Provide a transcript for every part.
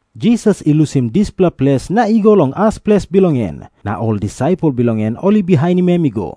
Jisas i lusim dispela ples na i go long as ples bilong en. Na ol disaipel bilong en ol i bihainim em i go.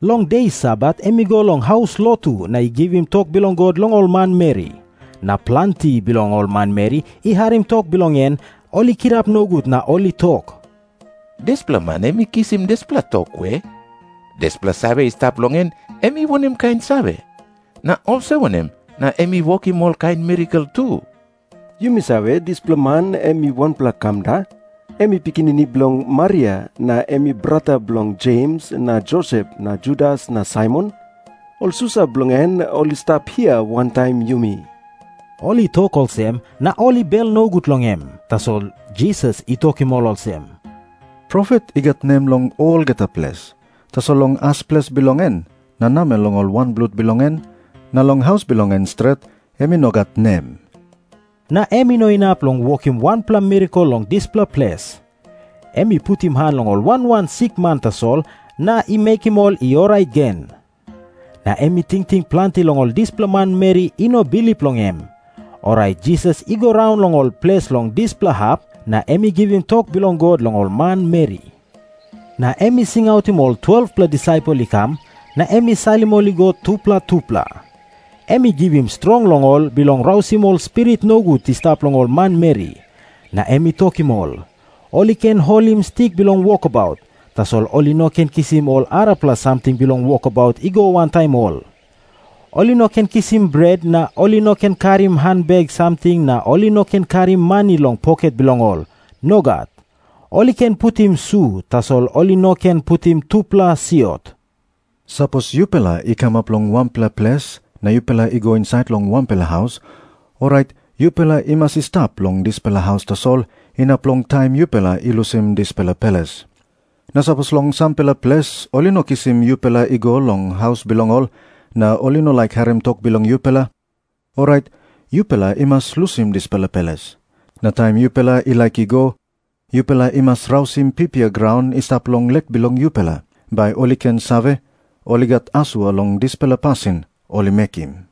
Long de Sabat em i go long haus lotu na i givim tok bilong God long ol manmeri. Na planti bilong ol manmeri i harim tok bilong en, ol i kirap nogut na ol i tok, “Dispela man em i kisim dispela tok we? Dispela save i stap long en, em i wanem kain save? Na olsem wanem na em i wokim olkain mirakel tu? Yumi save, dispela man em i wanpela kamda. Em i pikinini bilong Maria, na em i brata bilong Jems na Josep na Judas na Saimon. Ol susa bilong en ol i stap hia wantaim yumi.” Ol i tok olsem, na ol i bel nogut long em. Tasol Jisas i tokim ol olsem, “Profet i gat nem long olgeta ples. Tasol long as ples bilong en, na namel long ol wanblut bilong en, na long haus bilong en stret, em i no gat nem.” Na em i no inap long wokim wanpela mirakel long dispela ples. Em i putim han long ol wan wan sikman tasol na i mekim ol i orait gen. Na em i tingting planti long ol dispela manmeri i no bilip long em. Orait Jisas i go raun long ol ples long dispela hap, na em i givim tok bilong God long ol manmeri. Na em i singautim ol 12-pela disaipel i kam, na em i salim ol i go tupela tupela. Em i givim strong long ol bilong rausim ol spirit nogut i stap long ol manmeri. Na em i tokim ol, ol i ken holim stik bilong wokabaut, tasol ol i no ken kisim ol arapela samting bilong wokabaut i go wantaim ol. Ol i no ken kisim bret na ol i no ken karim hanbek samting na ol i no ken karim mani long poket bilong ol. Nogat. Ol i ken putim su, tasol ol i no ken putim tupela siot. Na em i tokim ol olsem, “Sapos yupela i kamap long wanpela ples na yupela i go insait long wanpela haus, orait yupela i mas i stap long dispela haus tasol inap long taim yupela i lusim dispela ples. Na sapos long sampela ples ol i no kisim yupela i go long haus bilong ol, na ol i no laik harim tok bilong yupela, orait yupela i mas lusim dispela ples. Na taim yupela i laik i go, yupela i mas rausim pipia graun i stap long lek bilong yupela, bai ol i ken save, ol i gat asua long dispela pasin ol i mekim.”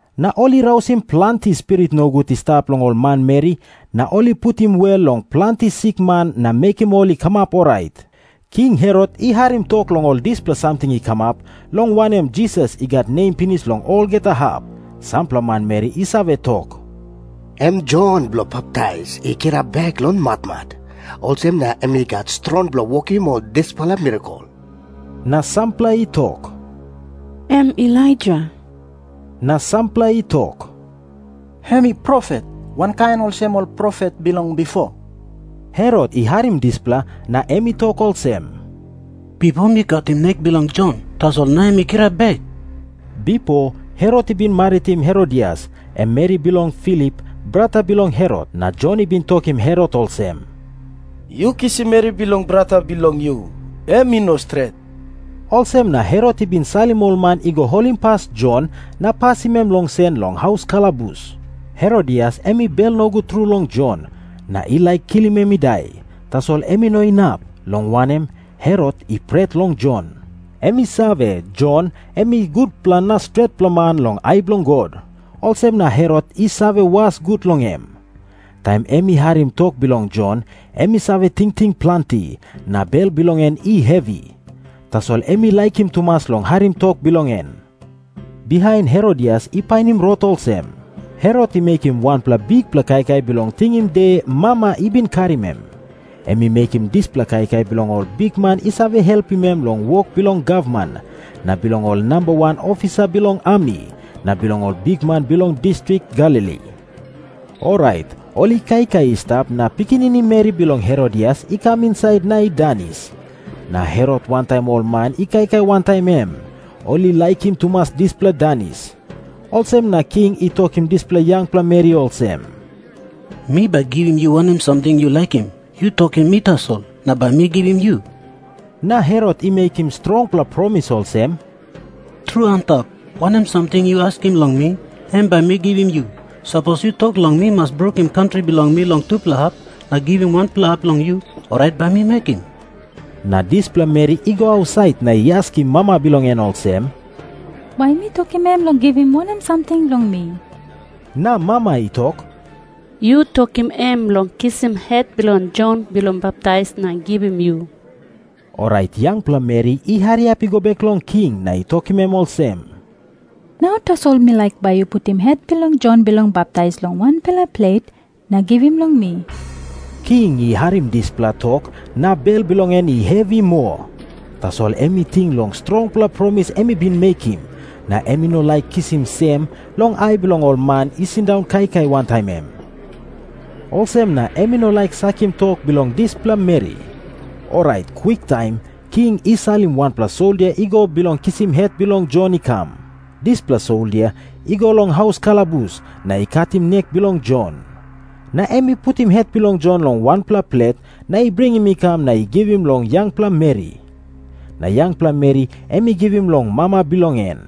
Na ol i rausim planti spirit nogut i stap long ol manmeri, na ol i putim wel long planti sikman na mekim ol i kamap orait. King Herot i harim tok long ol dispela samting i kamap, long wanem, Jisas i gat nem pinis long olgeta hap. Sampela manmeri i save tok, “Em Jon Bilong Baptais i kirap bek long matmat. Olsem na em i gat strong bilong wokim ol dispela mirakel.” Na sampela i tok, “Em Elaija.” Na sampela i tok, “Em i profet, wankain olsem ol profet bilong bipo.” Herot i harim dispela, na em i tok olsem, “Bipo mi katim nek bilong Jon, tasol nau em i kirap bek.” Bipo Herot i bin maritim Herodias, em meri bilong Filip, brata bilong Herot. Na Jon i bin tokim Herot olsem, “Yu kisim meri bilong brata bilong yu, em i no stret.” Olsem na Herot i bin salim ol man i go holimpas Jon na pasim em long sen long haus kalabus. Herodias em i bel nogut tru long Jon, na i laik kilim em i dai, tasol em i no inap, long wanem, Herot i pret long Jon. Em i save, Jon em i gutpela na stretpela man long ai bilong God. Olsem na Herot i save was gut long em. Taim em i harim tok bilong Jon, em i save tingting planti, na bel bilong en i hevi. Tasol em i laikim tumas long harim tok bilong en. Bihain Herodias i painim rot olsem. Herot i mekim wanpela bikpela kaikai bilong tingim de mama i bin karim em. Em i mekim dispela kaikai bilong ol bikman i save helpim em long wok bilong gavman, na bilong ol namba wan ofisa bilong ami, na bilong ol bikman bilong distrik Galili. Orait ol i kaikai i stap na pikinini meri bilong Herodias i kam insait na i danis. Na Herot wantaim ol man i kaikai wantaim em, ol i laikim tumas dispela danis. Olsem na king i tokim dispela yangpela meri olsem, “Mi bai givim yu wanem samting yu laikim. Yu tokim mi tasol, na bai mi givim yu.” Na Herot i mekim strongpela promis olsem, “Tru antap, wanem samting yu askim long mi, em bai mi givim yu. Sapos yu tok long mi mas brukim kantri bilong mi long tupela hap na givim wanpela hap long yu, orait bai mi mekim.” Na dispela meri i go ausait na i askim mama bilong en olsem, “Bai mi tokim em long givim wanem samting long mi?” Na mama i tok, “Yu tokim em long kisim het bilong Jon Bilong Baptais na givim yu.” Orait yangpela meri i hariap i go bek long king, na i tokim em olsem, “Nau tasol mi laik bai yu putim het bilong Jon Bilong Baptais long wanpela plet, na givim long mi.” King i harim dispela tok na bel bilong en i hevi moa. Tasol em i ting long strongpela promis em i bin mekim, na em i no laik kisim sem long ai bilong ol man i sindaun kaikai wantaim em. Olsem na em i no laik sakim tok bilong dispela meri. Orait kwiktaim king i salim wanpela soldia i go bilong kisim het bilong Jon i kam. Dispela soldia i go long haus kalabus, na i katim nek bilong Jon. Na em i putim het bilong Jon long wanpela plet na i bringim i kam na i givim long yangpela meri. Na yangpela meri em i givim long mama bilong en.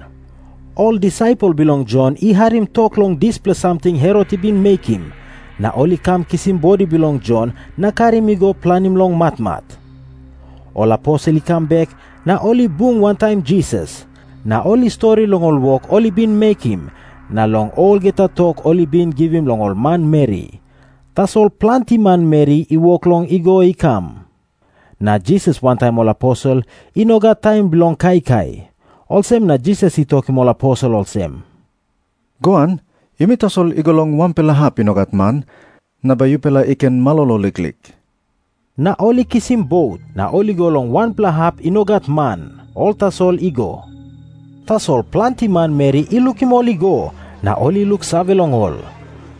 Ol disaipel bilong Jon i harim tok long dispela samting Herot i bin mekim, na ol i kam kisim bodi bilong Jon na karim i go planim long matmat. Ol aposel i kam bek na ol i bung wantaim Jisas. Na ol i stori long ol wok ol i bin mekim, na long olgeta tok ol i bin givim long ol manmeri. Tasol planti manmeri i wok long i go i kam, na Jisas wantaim ol aposel i no gat taim bilong kaikai. Olsem na Jisas i tokim ol aposel olsem, “Goan, yumi tasol i go long wanpela hap i no gat man, na bai yupela i ken malolo liklik.” Na ol i kisim bot, na ol i go long wanpela hap i no gat man. Ol tasol i go. Tasol planti manmeri i lukim ol i go, na ol i luksave long ol.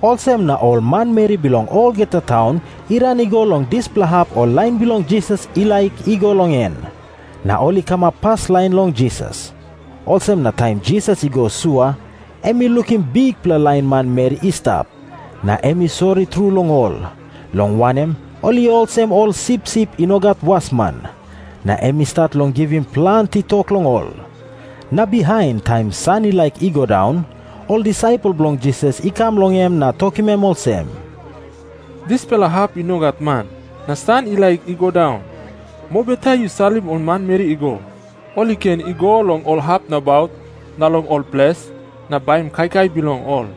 Olsem na ol manmeri bilong olgeta taun i ran i go long dispela hap ol lain bilong Jisas i laik i go long en, na ol i kamap paslain long Jisas. Olsem na taim Jisas i go sua em i lukim bikpela lain manmeri i stap. Na em i sori tru long ol, long wanem, ol i olsem ol sipsip i no gat wasman. Na em i stat long givim planti tok long ol. Na bihain, taim san i laik i go daun, ol disaipel bilong Jisas i kam long em na tokim em olsem, “Dispela hap i no gat man, na san i laik i go daun. Mobeta yu salim ol manmeri i go. Ol i ken i go long ol hap nabaut na long ol ples, na baim kaikai bilong ol.”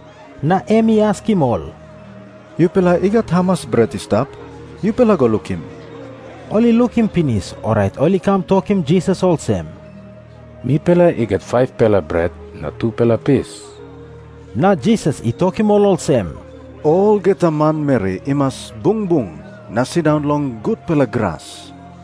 Na em i askim ol, “Yupela i gat hamas bret i stap? Yupela go lukim.” Ol i lukim pinis, orait ol i kam tokim Jisas olsem, “Mipela i gat 5-pela bret na tupela pis.” Na Jisas i tokim ol olsem, “Olgeta manmeri i mas bung bung na sindaun long gutpela gras.”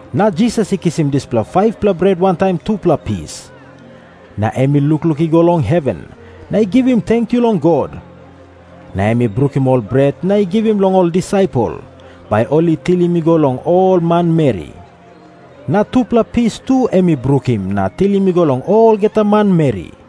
Na Jisas i kisim dispela 5-pela bret wantaim tupela pis. Na em i lukluk i go long heven, na i givim tenkyu long God. Na em i brukim ol bret na i givim long ol disaipel, bai ol i tilim i go long ol manmeri. Na tupela pis tu em i brukim na tilim i go long olgeta manmeri.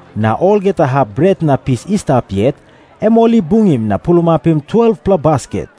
Na olgeta hap bret na pis i stap yet, em ol i bungim na pulapim 12-pela basket.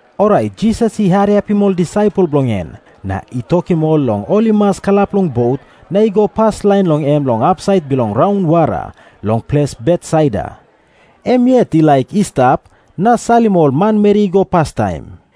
Orait Jisas i hariapim ol disaipel bilong en, na i tokim ol long ol i mas kalap long bot na i go paslain long em long hapsait bilong raunwara, long ples Betsaida. Em yet i laik i stap na salim ol manmeri i go pastaim.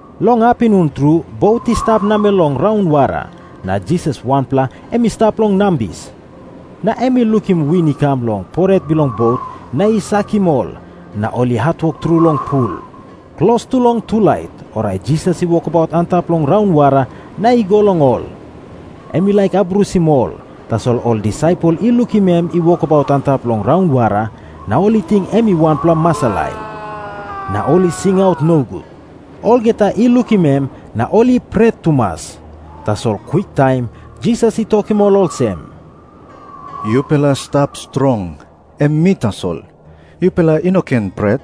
Long apinun tru bot i stap namel long raunwara, na Jisas wanpela em i stap long nambis. Na em i lukim win i kam long poret bilong bot na i sakim ol, na ol i hatwok tru long pul. Klostu long tulait, orait Jisas i wokabaut antap long raunwara na i go long ol. Em i laik abrusim ol, tasol ol disaipel i lukim em i wokabaut antap long raunwara, na ol i ting em i wanpela masalai. Na ol i singaut nogut. Olgeta i lukim em, na ol i pret tumas. Tasol kwiktaim Jisas i tokim ol olsem, “Yupela stap strong. Em mi tasol. Yupela i no ken pret.”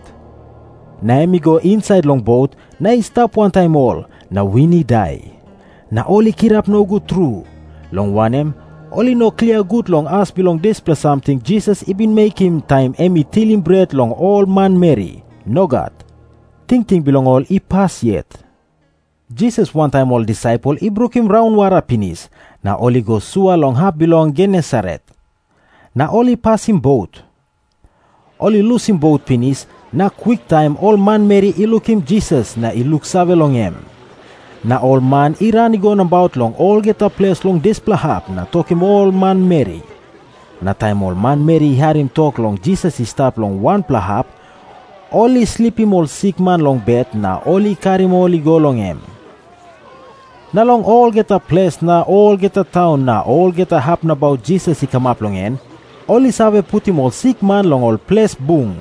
Na em i go insait long bot, na i stap wantaim ol, na win i dai. Na ol i kirap nogut tru, long wanem, ol i no klia gut long as bilong dispela samting Jisas i bin mekim taim em i tilim bret long ol manmeri. Nogat. Tingting bilong ol i pas yet. Jisas wantaim ol disaipel i brukim raunwara pinis, na ol i go sua long hap bilong Genesaret, na ol i pasim bot. Ol i lusim bot pinis, na kwiktaim ol manmeri i lukim Jisas na i luksave long em. Na ol man i ran i go nabaut long olgeta ples long dispela hap na tokim ol manmeri. Na taim ol manmeri i harim tok long Jisas i stap long wanpela hap, ol i slipim ol sikman long bet, na ol i karim ol i go long em. Na long olgeta ples na olgeta taun na olgeta hap nabaut Jisas i kamap long en, ol i save putim ol sikman long ol ples bung.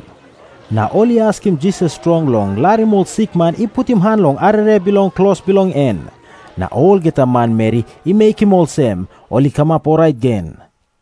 Na ol i askim Jisas strong long larim ol sikman i putim han long arere bilong klos bilong en. Na olgeta manmeri i mekim olsem, ol i kamap orait gen.